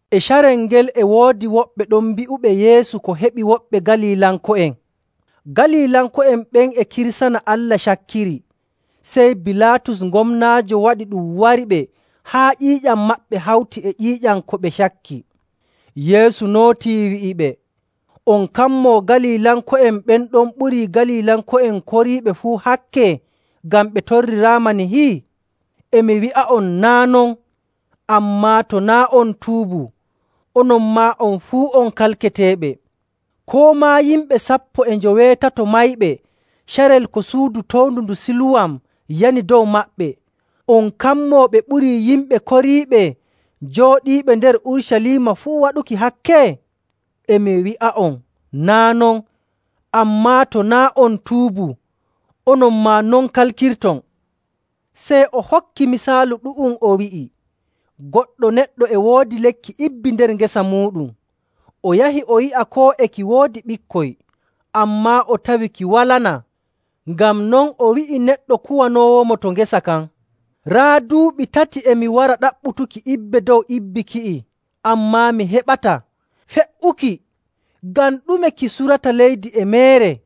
E carel ngel e woodi woɓɓe ɗon bi'uɓe Yeesu ko heɓi woɓɓe Galilanko'en. Galilanko'en ɓen e kirsana Allah cakkiri, sey Bilaatus gomnaajo waɗi ɗum wariɓe haa ƴiiƴam maɓɓe hawtii e ƴiiƴam ko ɓe cakki. Yeesu nootii wi'iɓe, “On kammoo Galilanko'en ɓen ɗon ɓurii Galilanko'en koriiɓe fuu hakke ngam ɓe torriraama nihi? E mi wi'a'on, naa' non! Ammaa to naa' on tuubu, onon maa on fuu on kalketeeɓe. Koo maa yimɓe sappo e njoweetato mayɓe carel ko suudu towndu ndu Siluwam yani dow maɓɓe, on kammoo ɓe ɓurii yimɓe koriiɓe jooɗiiɓe nder Urucaliima fuu waɗuki hakke? E mi wi'a'on, naa' non! Ammaa to naa' on tuubu, onon maa non kalkirton.” Sey o hokki misaalu ɗu'um, o wi'i, “Goɗɗo neɗɗo e woodi lekki ibbi nder ngesa muuɗum, o yahi o yi'a koo e ki woodi ɓikkoy, ammaa o tawi ki walanaa. Ngam non o wi'i neɗɗo kuwanoowomo to ngesa kan, ‘Raa, duuɓi tati e mi wara ɗaɓɓutuki ibbe dow ibbi ki'i, ammaa mi heɓataa. Fe''uki! Ngam ɗume ki surata leydi e meere?’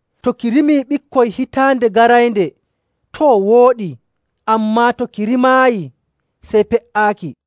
To ki rimii ɓikkoy hitaande garaynde, too, wooɗii, ammaa to ki rimaayi, sey pe''aaki.’”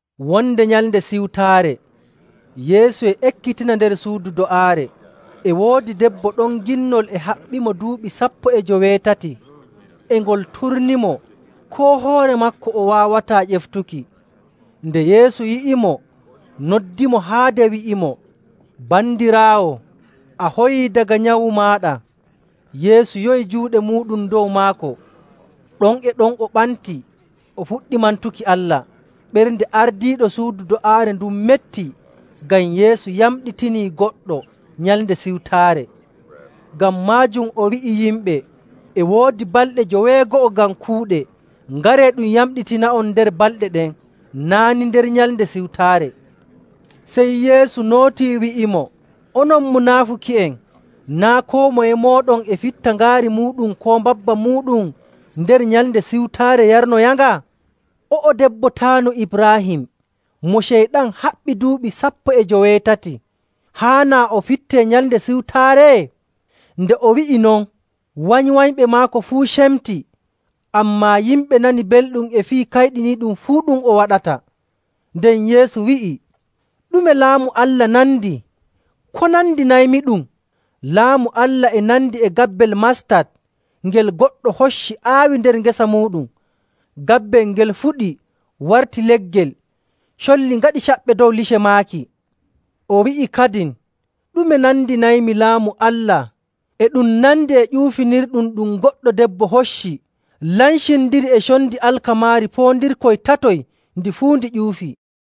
Wonde Nyalnde Siwtaare Yeesu e ekkitina nder suudu do'aare. E woodi debbo ɗon ginnol e haɓɓimo duuɓi sappo e joweetati, e ngol turnimo, koo hoore maako o waawataa ƴeftuki. Nde Yeesu yi'imo, noddimo haade, wi'imo, “Bandiraawo, a hoyii daga nyawu maaɗa.” Yeesu yowi juuɗe muuɗum dow maako, ɗon e ɗon o ɓantii o fuɗɗi mantuki Allah. Ɓernde ardiiɗo suudu do'aare ndun metti ngam Yeesu yamɗitinii goɗɗo Nyalnde Siwtaare. Ngam maajum o wi'i yimɓe, “E woodi balɗe joweego'o ngam kuuɗe, ngaree ɗum yamɗitina'on nder balɗe ɗen, naa' ni nder Nyalnde Siwtaare.”. Sey Yeesu nootii wi'imo, “Onon munaafuki'en! Naa' koo moye mooɗon e fitta ngaari muuɗum koo mbabba muuɗum nder Nyalnde Siwtaare yarnoyanga? O'o debbo taanu Ibraahim, mo Ceyɗan haɓɓi duuɓi sappo e joweetati, haanaa o fittee Nyalnde Siwtaare?” Nde o wi'i non, wanywanyɓe maako fuu cemti, ammaa yimɓe nani belɗum e fii kayɗiniiɗum fuu ɗum o waɗata. Nden Yeesu wi'i, “Ɗume Laamu Allah nandi? Ko nandinaymiɗum? Laamu Allah e nandi e gabbel mastat ngel goɗɗo hocci aawi nder ngesa muuɗum. Gabbel ngel fuɗi, warti leggel, colli ngaɗi caɓɓe dow lice maaki.” O wi'i kadin, “Ɗume nandinaymi Laamu Allah? E ɗum nandi e ƴuufinirɗum ɗum goɗɗo debbo hocci lancindiri e condi alkamaari poondirkoy tatoy ndi fuu ndi ƴuufi.”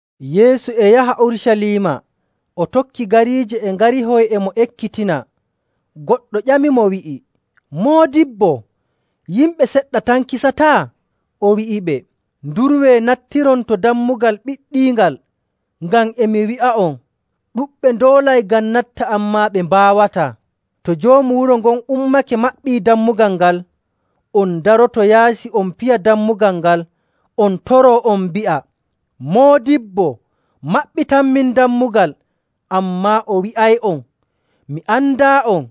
Yeesu e yaha Urucaliima o tokki gariije e ngarihoy e mo ekkitina. Goɗɗo ƴamimo wi'i, “Moodibbo, yimɓe seɗɗa tan kisata?” O wi'iɓe, “Ndurwee nattiron to dammugal ɓiɗɗiingal, ngam e mi wi'a'on, ɗuɗɓe ndoolay ngam natta ammaa ɓe mbaawataa. To joomu wuro ngon ummake maɓɓii dammugal ngal, on ndaroto yaasi on piya dammugal ngal on toroo on mbi'a, ‘Moodibbo, maɓɓitanmin dammugal!’ Ammaa o wi'ay'on, ‘Mi andaa'on,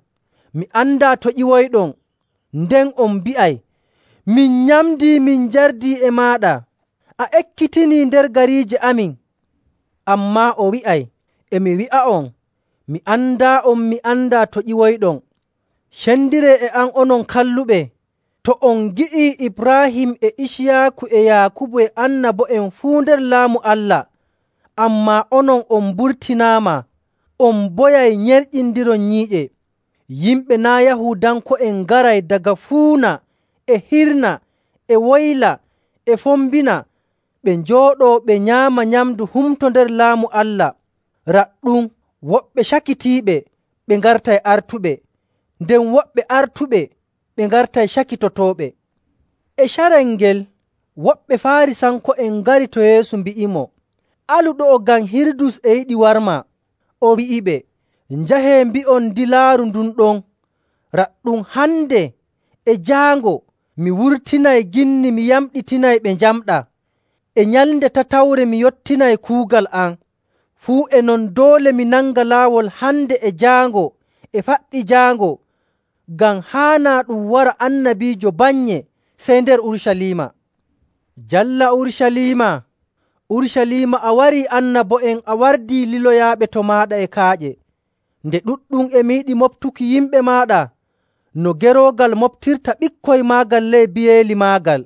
mi andaa to ƴiwoyɗon.’ Nden on mbi'ay, ‘Min nyamdii, min njardii e maaɗa, a ekkitinii nder gariije amin.’ Ammaa o wi'ay, ‘E mi wi'a'on, mi andaa'on, mi andaa to ƴiwoyɗon. Cendiree e am, onon kalluɓe.’. To on ngi'ii Ibraahim e Iciyaaku e Yaakubu e annabo'en fuu nder Laamu Allah, ammaa onon on mburtinaama, on mboyay nyerƴindiron nyiiƴe.. Yimɓe naa' Yahuudanko'en ngaray daga fuuna e hirna e woyla e fombina ɓe njooɗoo ɓe nyaama nyamndu humto nder Laamu Allah.. Raɗɗum, woɓɓe cakitiiɓe ɓe ngartay artuɓe, nden woɓɓe artuɓe ɓe ngartay cakitotooɓe.”. E carel ngel, woɓɓe Faarisanko'en ngari to Yeesu mbi'imo, “Alu ɗo'o ngam Hirudus e yiɗi warmaa.” O wi'iɓe, “Njahee mbi'on dilaaru ndun ɗon, ‘Raɗɗum, hande e jaango mi wurtinay ginni mi yamɗitinay ɓe njamɗaa. E nyalnde tatawre mi yottinay kuugal am.’ Fuu e non, doole mi nanga laawol hande e jaango e faɓɓi jaango, ngam haanaa ɗum wara annabiijo bannye sey nder Urucaliima. “Jalla Urucaliima, Urucaliima a warii annabo'en, a wardii liloyaaɓe to maaɗa e kaaƴe! Nde ɗuɗɗum e mi yiɗi moɓtuki yimɓe maaɗa no geroogal moɓtirta ɓikkoy maagal ley biyeeli maagal,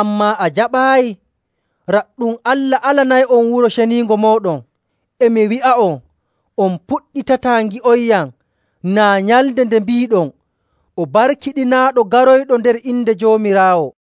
ammaa a jaɓaayi. Raɗɗum, Allah alanay'on Wuro Ceniingo mooɗon. E mi wi'a'on, on puɗɗitataa ngi'onyam, naa nyalnde nde mbiiɗon, ‘O barkiɗinaaɗo, garoyɗo nder inde Joomiraawo.’”.